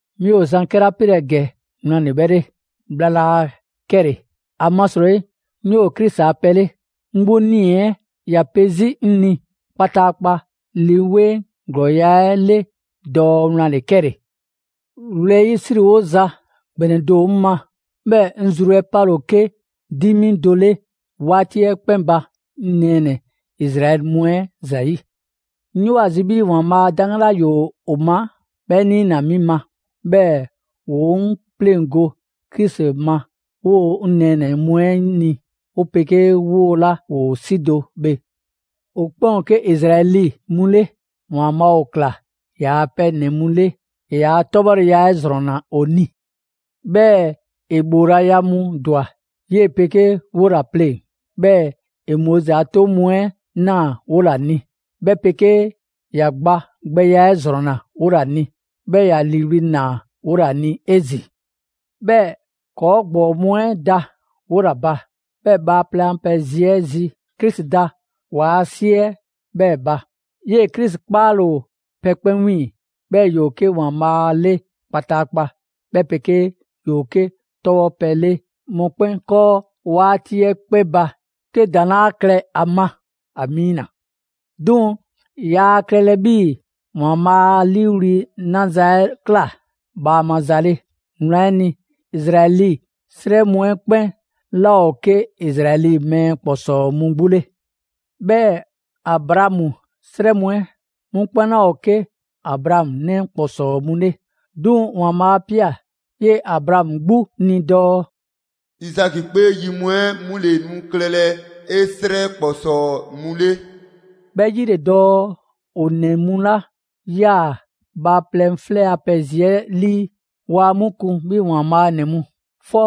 'Mi ‑o zan 'kɛla 'pelɛ‑ ‑gɛ wlan ‑le 'ke 'bhɛ 'le; bhla laa 'kɛle‑, ‑amasrɔyi 'ŋ 'yoo‑ Krisi a pɛ 'le. 'Ŋ 'gbu 'nii‑ 'ɛ ‑ya pe 'zi 'ŋ ni kpataakpa Lii 'Weŋ 'ɛ ‑glɔɔya' 'ɛ 'le dɔɔ wlan ‑le 'kɛle‑. Wlɛyisriwoza ‑gbɛnɛ do ‑o 'ŋ ma, 'bhɛɛ‑ 'ŋ zru 'ɛ 'pale ‑o 'ke 'dimi do 'le 'waati 'ɛ 'kpɛn ba 'ŋ nɛɛnɛ‑ Izraɛli mu 'ɛ ‑zayi'. 'Ŋ 'yoo‑ ‑a zi 'bhii‑ ‑Waanbhaa' a 'daŋgan 'la ‑yoo ‑o ma 'bhɛ 'niina‑ 'mi ma, 'bhɛɛ‑ ‑wo 'ŋ 'pleŋgo‑ Krisi ma 'woo‑ 'ŋ nɛɛnɛ‑ mu 'ɛ ni, 'o 'pegee 'woo‑ 'la ‑woo 'si do bhe. ‑O 'kpɛn ‑o 'ke Izraɛli mu 'le. ‑Waanbhaa' ‑o ꞊kla ‑yaa' pɛ ‑nɛ mu 'le, ‑e ‑yaa' 'tɔbhɔleya 'ɛ ‑zrɔnna ‑o ni. 'Bhɛɛ‑ ‑e ‑bhoolaya mu ‑dwa 'yee‑ 'pegee 'wola‑ pleŋ‑, 'bhɛɛ‑ ‑e Moizi a 'toŋ mu 'ɛ ꞊naa 'wola‑ ni, 'bhɛ 'pegee ‑ya gba gbɛya 'ɛ ‑zrɔnna 'wola‑ ni. 'Bhɛɛ‑ ‑ya ‑liiwli' ꞊naa 'wola‑ ni 'ezin‑. 'Bhɛɛ‑ ‑kɔɔ' ‑gbɔɔ mu 'ɛ da 'wola‑ ba, 'bhɛɛ‑ bhaaplɛŋ a pɛ zi 'ɛ zi, Krisi da ‑waa' 'si 'ɛ 'bhɛɛ‑ ba. 'Yee‑ Krisi 'kpaale‑ ‑o pɛ 'kpɛn 'wiiŋ‑, 'bhɛɛ‑ ‑yoo 'ke ‑Waanbhaa' 'le kpataakpa, 'bhɛ 'pegee ‑yoo 'ke 'tɔbhɔpɛ 'le mɔkpɛn' 'kɔɔ 'waati 'ɛ 'kpɛn ba 'ke ‑daŋ' 'laa klɛ a ma. Amiina! 'Duŋ‑, yaa klɛlɛ 'bhii‑ ‑Waanbhaa' 'a 'liiwli‑ naza 'ɛ ꞊kla bhaama za 'le. Wlan 'ɛ ni, Izraɛli 'srɛ mu 'ɛ 'kpɛn 'laa ‑o 'ke Izraɛli mɛɛ ‑kpɔsɔɔ mu 'gbu 'le. 'Bhɛɛ‑ Abraamu 'srɛ mu 'ɛ, 'mu 'kpɛn 'laa ‑o 'ke Abraamu 'nɛ ‑kpɔsɔɔ mu 'le; 'duŋ‑ ‑Waanbhaa' 'a ꞊pia 'yee‑ Abraamu 'gbu ni dɔɔ: «Izaki 'kpee yi mu 'ɛ, 'mu ‑le nu klɛlɛ 'e 'srɛ ‑kpɔsɔɔ mu 'le.» 'Bhɛ 'yi ‑le dɔɔ ‑o ‑nɛ mu 'la ꞊yaa bhaaplɛŋ 'flɛ a pɛ zi 'lii, waa 'mu kun 'bhii‑ ‑Waanbhaa' ‑nɛ mu. 'Fɔ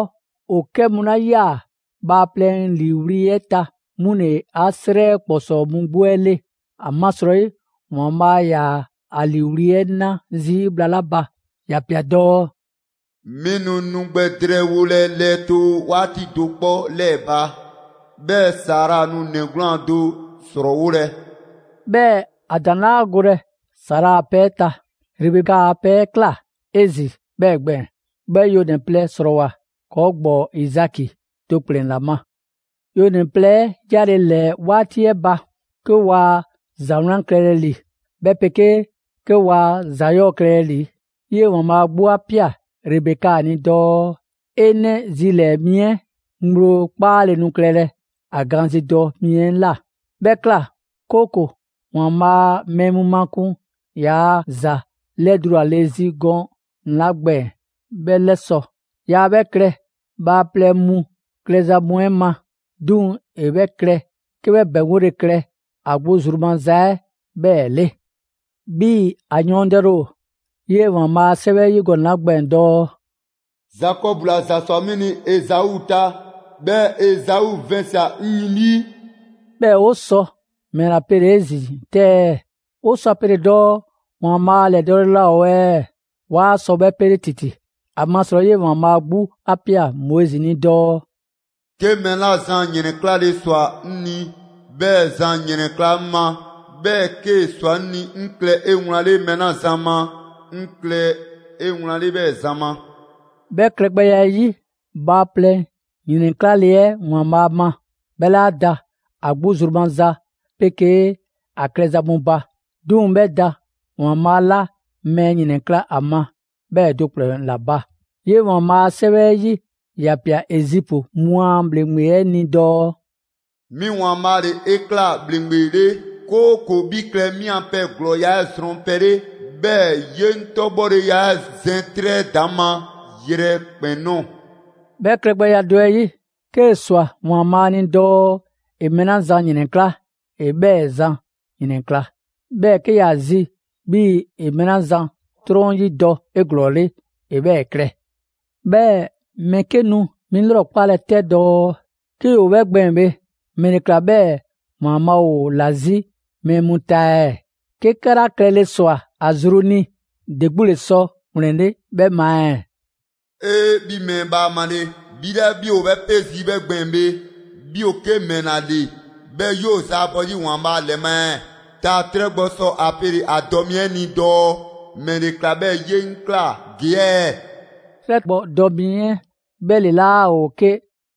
‑o 'kɛ mu 'la ꞊yaa ‑Waanbhaa' ‑liiwli' 'ɛ ta, 'mu ‑le 'a 'srɛ ‑kpɔsɔɔ mu 'gbu 'ɛ 'le. ‑Amasrɔyi, ‑Waanbhaa' 'yaa‑ ‑a ‑liiwli' 'ɛ 'na zii' bhla 'la ba, ‑ya ‑pia dɔɔ: «'Mi nu nu gbɛ drɛɛwolɛ lɛɛtoo 'waati do 'kpɔ 'lɛɛ‑ ba, 'bhɛɛ‑ Sara nu ‑nɛ 'gwlaan‑ do ‑srɔɔwolɛ.» 'Bhɛɛ‑ ‑a ‑daŋ' 'laa golɛ Sara a pɛ 'ɛ ta. Rebeka a pɛ 'ɛ ꞊kla 'ezin‑ 'bhɛɛ‑ gbɛɛn‑. 'Bhɛ yonɛ‑ plɛ 'srɔɔwoa꞊ ‑kɔɔ' ‑gbɔɔ Izaki do ‑kplɛn ‑la ma. Yonɛ‑ plɛ 'ɛ 'yale‑ ‑lɛɛ 'waati 'ɛ ba, 'ke waa ‑za 'wlan klɛlɛ ‑li, 'bhɛ 'pegee 'ke waa ‑za 'yɔɔ‑ klɛlɛ ‑li, 'yee‑ ‑Waanbhaa' 'gbu 'a ꞊pia Rebeka ni dɔɔ: 'E 'nɛ zilɛɛ‑ mi 'ɛ ŋgblo 'kpaale‑ nu klɛlɛ ‑a gaanzidɔ mi 'ɛ ꞊la. 'Bhɛ ꞊kla 'kooko‑ ‑Waanbhaa' mɛɛ mu makun ‑yaa' ‑za 'lɛdulale zi gɔnɛ‑ 'la gbɛɛn‑ 'bhɛ 'lɛsɔ‑. Yaa 'bhɛ klɛ bhaaplɛŋ mu klɛza mu 'ɛ ma, 'duŋ‑ ‑e 'bhɛ klɛ 'ke 'bhɛ ‑bɛŋgole klɛ ‑a 'gbu a zru maza 'ɛ 'bhɛɛ‑ 'le. 'Bhii‑ ‑a yɔɔndɛle ‑o 'yee‑ ‑Waanbhaa' a 'Sɛwɛ 'ɛ 'yi gɔnɛ‑ 'la gbɛɛn‑ dɔɔ: «Zakɔbu ‑la ‑za ꞊swa 'mi ni Ezau ta. 'Bhɛɛ‑ Ezau vɛnsia‑ 'ŋ yin 'lii.» 'Bhɛɛ‑ 'o sɔ ‑mɛla pele‑ 'ezin‑ 'tɛ ɛɛ? 'O sɔ ‑a pele dɔɔ ‑Waanbhaa' ‑lɛdɔɔle laa ‑o ɛɛ? 'Waa sɔ 'bhɛ 'pele ‑titi. ‑Amasrɔyi 'yee‑ ‑Waanbhaa' 'gbu 'a ꞊pia Moizi ni dɔɔ: «'Ke mɛɛ 'la zan ‑yrɛnklale ꞊swa 'ŋ ni, 'bhɛɛ‑ zan ‑yrɛnkla' 'ŋ ma. 'Bhɛɛ‑ 'kee‑ ꞊swa 'ŋ ni 'ŋ klɛ 'ewlanle mɛɛ 'la zan ma, 'ŋ klɛ 'ewlanle 'bhɛɛ‑ zan ma.» 'Bhɛ klɛgbɛya 'ɛ 'yi, bhaaplɛŋ ‑yrɛnklale 'ɛ ‑Waanbhaa' ma, 'bhɛ 'laa da ‑a 'gbu zru maza 'pegee ‑a klɛza mu ba, 'duŋ‑ 'bhɛ da ‑Waanbhaa' 'la mɛɛ ‑yrɛnkla' a ma 'bhɛɛ‑ do ‑kplɛn ‑la ba. 'Yee‑ ‑Waanbhaa' a 'Sɛwɛ 'ɛ 'yi, ‑ya ꞊pia Ezipu mu a ‑bhleŋgbe 'ɛ ni dɔɔ: «'Mi ‑Waanbhaa' ‑le 'e ꞊kla ‑bhleŋgbe 'le, 'kooko‑ 'bhi klɛ 'mi a pɛ ‑glɔɔya' 'ɛ zrɔnpɛ 'le, 'bhɛɛ‑ 'ye 'ŋ 'tɔbhɔleya 'ɛ zɛn 'trɛ 'ɛ ‑daŋ' ma yrɛkpɛn‑ ꞊nɔɔ.» 'Bhɛ klɛgbɛya 'ɛ 'yi, 'kee‑ ꞊swa ‑Waanbhaa' ni dɔɔ ‑e mɛɛ 'la zan ‑yrɛnkla', ‑e 'bhɛɛ‑ zan ‑yrɛnkla'. 'Bhɛɛ‑ 'ke ‑ya zi 'bhii‑ ‑e mɛɛ 'la zan 'trɔn 'yidɔ‑ 'eglɔɔle, ‑e 'bhɛɛ‑ klɛ. 'Bhɛɛ‑ mɛɛ 'ke nu 'mi 'lrɔkpalɛ 'tɛ dɔɔ: «'Ke ‑yoo 'bhɛ gbɛɛn‑ bhe, ‑mɛle ꞊kla 'bhɛɛ‑ ‑Waanbhaa' ‑o ‑la 'zi mɛɛ mu ta ɛɛ? 'Ke 'kɛla klɛle ꞊swa ‑a zru ni, ‑de 'gbu ‑le sɔ ‑wlɛnle' 'bhɛ ma ɛɛ?» 'Ee! 'Bhi mɛɛ bhaamale! 'Bhi 'la 'bhi ‑o 'bhɛ 'pe zii' 'bhɛ gbɛɛn‑ bhe, 'bhi ‑o 'ke ‑mɛla ‑le 'bhɛɛ‑ 'yoo‑ zaabɔ 'zi ‑Waanbhaa' 'lɛ ma ɛɛ? Taa‑ 'trɛ gbɔ sɔ ‑a pele‑ ‑a dɔ mi 'ɛ ni dɔɔ: «‑Mɛle ꞊kla 'bhɛɛ‑ 'ye 'ŋ ꞊kla ‑gee' ɛɛ?» 'Trɛ gbɔ dɔ mi 'ɛ 'bhɛ ‑le 'laa ‑o 'ke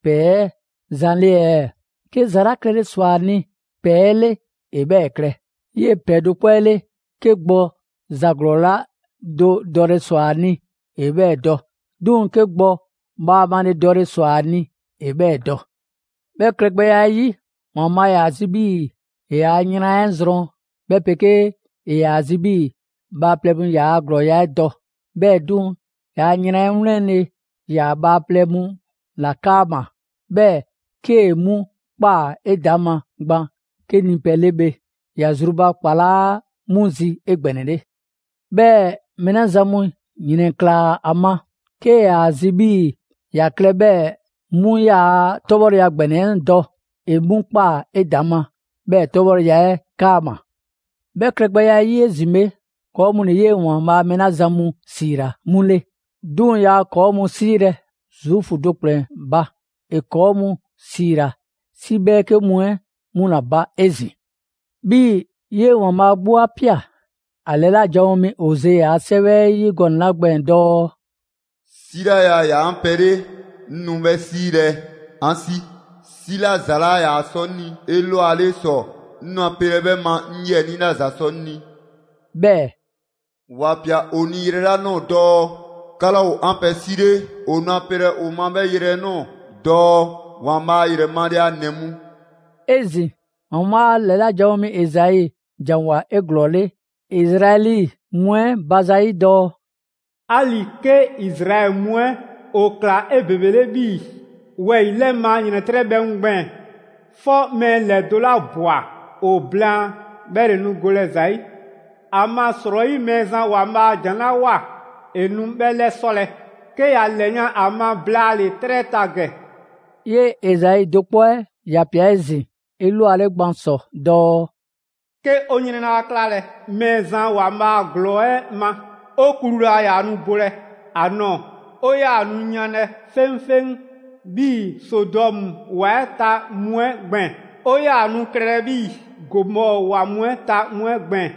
‑pɛɛ 'ɛ zan 'le ɛɛ? 'Ke ‑za 'la klɛle ꞊swa ‑a ni ‑pɛɛ 'ɛ 'le, ‑e 'bhɛɛ‑ klɛ. 'Yee‑ ‑pɛɛ do 'kpɔ 'ɛ 'le, 'ke gbɔ ‑za ‑glɔɔ do dɔle ꞊swa ‑a ni, ‑e 'bhɛɛ‑ dɔ; 'duŋ‑ 'ke gbɔ bhaamale dɔle ꞊swa ‑a ni, ‑e 'bhɛɛ‑ dɔ. 'Bhɛ klɛgbɛya 'ɛ 'yi, ‑Waanbhaa' ‑yaa ‑a zi 'bhii‑ ‑e ‑yaa' yran 'ɛ zrɔn, 'bhɛ 'pegee ‑e ‑yaa ‑a zi 'bhii‑ bhaaplɛŋ mu ‑yaa' ‑glɔɔya' 'ɛ dɔ. 'Bhɛɛ‑ 'duŋ‑, ‑yaa' yran 'ɛ 'wlɛnle‑ ‑yaa bhaaplɛŋ mu 'la 'kaama‑, 'bhɛɛ‑ 'kee‑ 'mu ꞊kpaa 'edaŋma gban 'ke nipɛ 'le bhe, ‑ya zrubakpalaa 'mu zi 'egbɛnɛle. 'Bhɛɛ‑ mɛɛ 'la zan mu 'yrɛnklaa꞊ ‑a ma, 'kee‑ ‑yaa zi 'bhii‑ ‑ya klɛ 'bhɛɛ‑ 'mu ‑yaa' 'tɔbhɔleya ‑gbɛnɛ 'ɛ dɔ, ‑e 'mu ꞊kpaa 'edaŋma 'bhɛɛ‑ 'tɔbhɔleya 'ɛ 'kaama‑. 'Bhɛ klɛgbɛya 'ɛ 'yi 'ezin‑ bhe, ‑kɔɔ' mu ‑le 'yee‑ ‑Waanbhaa' mɛɛ 'la zan mu 'siila‑ 'mu 'le; 'duŋ‑ yaa ‑kɔɔ' mu 'siilɛ‑ Zuufu do ‑kplɛn ba, ‑e ‑kɔɔ' 'ke mu ‑siila 'si 'bhɛɛke mu 'ɛ 'mu ‑la ba 'ezin‑. 'Bhii‑ 'yee‑ ‑Waanbhaa' 'gbu 'a ꞊pia ‑a ‑lɛla' janwo mi Oze a 'sɛwɛ 'ɛ 'yi gɔnɛ‑ 'la gbɛɛn‑ dɔɔ: «'Si 'la yaa ‑yaa 'an pɛ 'le, 'ŋ nu 'bhɛ 'siilɛ‑ 'an 'si. 'Bhɛɛ‑ 'si 'la ‑za 'laa ‑yaa sɔ 'mi ni 'elwale ‑sɔ, 'ŋ nu ‑a pelɛ 'bhɛ ma 'ŋ 'yiɛnii 'la ‑za sɔ 'ŋ ni.» 'Bhɛɛ‑ «‑Wa ꞊pia ‑o ni yrɛ 'la ꞊nɔɔ dɔɔ: ‹'Ka 'laa ‑o 'an pɛ 'si 'le.› ‑O nu ‑a pelɛ ‑o ma 'bhɛɛ‑ yrɛ 'ɛ ꞊nɔɔ dɔɔ: ‹‑Waanbhaa' ‑yrɛ male a ‑nɛ mu.›» 'Ezin‑, ‑Waanbhaa' ‑lɛla' janwo mi Ezai ‑janwoa 'eglɔɔle Izraɛli mu 'ɛ ba zayi' dɔɔ: «'Ali‑ 'ke Izraɛli mu 'ɛ ‑o ꞊kla 'ebebele 'bhii‑ wɛyi‑ 'lɛ ma ‑yrɛntrɛbhɛ mu gbɛɛn‑, 'fɔ mɛɛ ‑lɛdo' 'la ꞊bwa ‑o blaan, 'bhɛ ‑le nu golɛ ‑za 'yi. ‑Amasrɔyi Mɛɛzan ‑Waanbhaa' ‑jan 'la ꞊woa, ‑e nu 'bhɛɛ‑ 'lɛsɔlɛ 'ke ‑ya ‑lɛyan' ‑a ma blaale‑ 'trɛ 'ɛ ta ‑gɛ.» 'Yee‑ Ezai do 'kpɔ 'ɛ ‑ya ꞊pia 'ezin‑ 'elwale gban ‑sɔ dɔɔ: «'Ke 'o 'yrɛn 'laa 'klalɛ‑ Mɛɛzan ‑Waanbhaa' ‑Glɔɔ 'ɛ ma, 'o klu laa ‑yaa nu bolɛ ‑a nɔɔ‑. 'O 'yaa‑ nu yanlɛ 'feŋfeŋ 'bhii‑ Sodɔmu ‑wa 'ɛ ta mu 'ɛ gbɛɛn‑. 'O 'yaa‑ nu klɛlɛ 'bhii‑ Gomɔɔ ‑wa mu 'ɛ ta mu 'ɛ gbɛɛn‑.»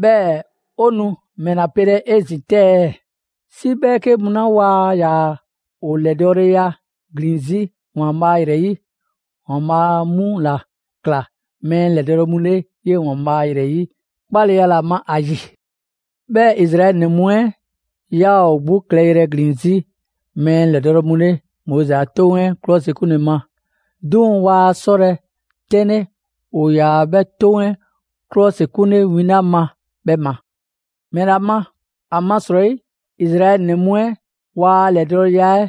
'Bhɛɛ‑ 'o nu ‑mɛla pelɛ 'ezin‑ 'tɛ ɛɛ? 'Si 'bhɛɛke mu 'la waa ‑yaa ‑o ‑lɛdɔɔleya ‑glin 'zi ‑Waanbhaa' ‑yrɛ 'yi, ‑Waanbhaa' 'mu ‑la ꞊kla mɛɛ ‑lɛdɔɔle mu 'le 'yee‑ ‑Waanbhaa' ‑yrɛ 'yi 'kpaleya ‑la ma ‑a ‑yi. 'Bhɛɛ‑ Izraɛli ‑nɛ mu 'ɛ 'yaa‑ ‑o 'gbu klɛyrɛ ‑glin 'zi mɛɛ ‑lɛdɔɔle mu 'le Moizi a 'Toŋ 'ɛ ‑klɔsikunle ma, 'duŋ‑ waa 'sɔlɛ‑ 'tɛnle ‑o ‑yaa 'bhɛ 'toŋ 'ɛ 'klɔsikunle win 'la ma 'bhɛ ma. ‑Mɛla ma? ‑Amasrɔyi Izraɛli ‑nɛ mu 'ɛ waa ‑lɛdɔɔleya 'ɛ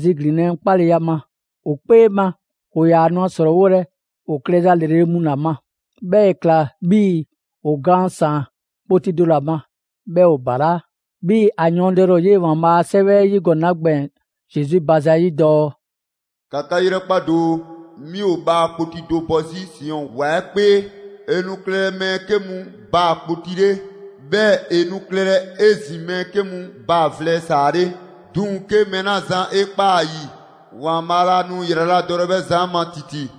ziglinlɛ 'kpaleya ma, ‑o 'kpee ma ‑o ‑yaa nu ‑a ‑srɔɔwolɛ ‑o klɛza ‑lrele' mu ‑la ma. 'Bhɛɛ‑ ‑e ꞊kla 'bhii‑ ‑o gaan ‑saan kpoti do ‑la ma, 'bhɛɛ‑ ‑o ‑balaa'. 'Bhii‑ 'a yɔɔndɛle ‑o 'yee‑ ‑Waanbhaa' a 'Sɛwɛ 'ɛ 'yi gɔnɛ‑ 'la gbɛɛn‑ Zesu ba zayi' dɔɔ: «‑Ka 'ka 'yrɛkpa doo, 'mi ‑o baa‑ kpoti do bɔ 'zi Siɔn ‑wa 'ɛ 'kpee. ‑E nu klɛlɛ mɛɛ 'ke mu baa‑ kpoti 'le. 'Bhɛɛ‑ ‑e nu klɛlɛ 'ezin‑ mɛɛ 'ke mu baa‑ vlɛ ‑saa 'le. 'Duŋ‑ 'ke mɛɛ 'la zan 'e ꞊kpaa ‑a ‑yi, ‑Waanbhaa' 'laa nu ‑yraladɔlɛ 'bhɛ zan 'ɛ ma ‑titi.»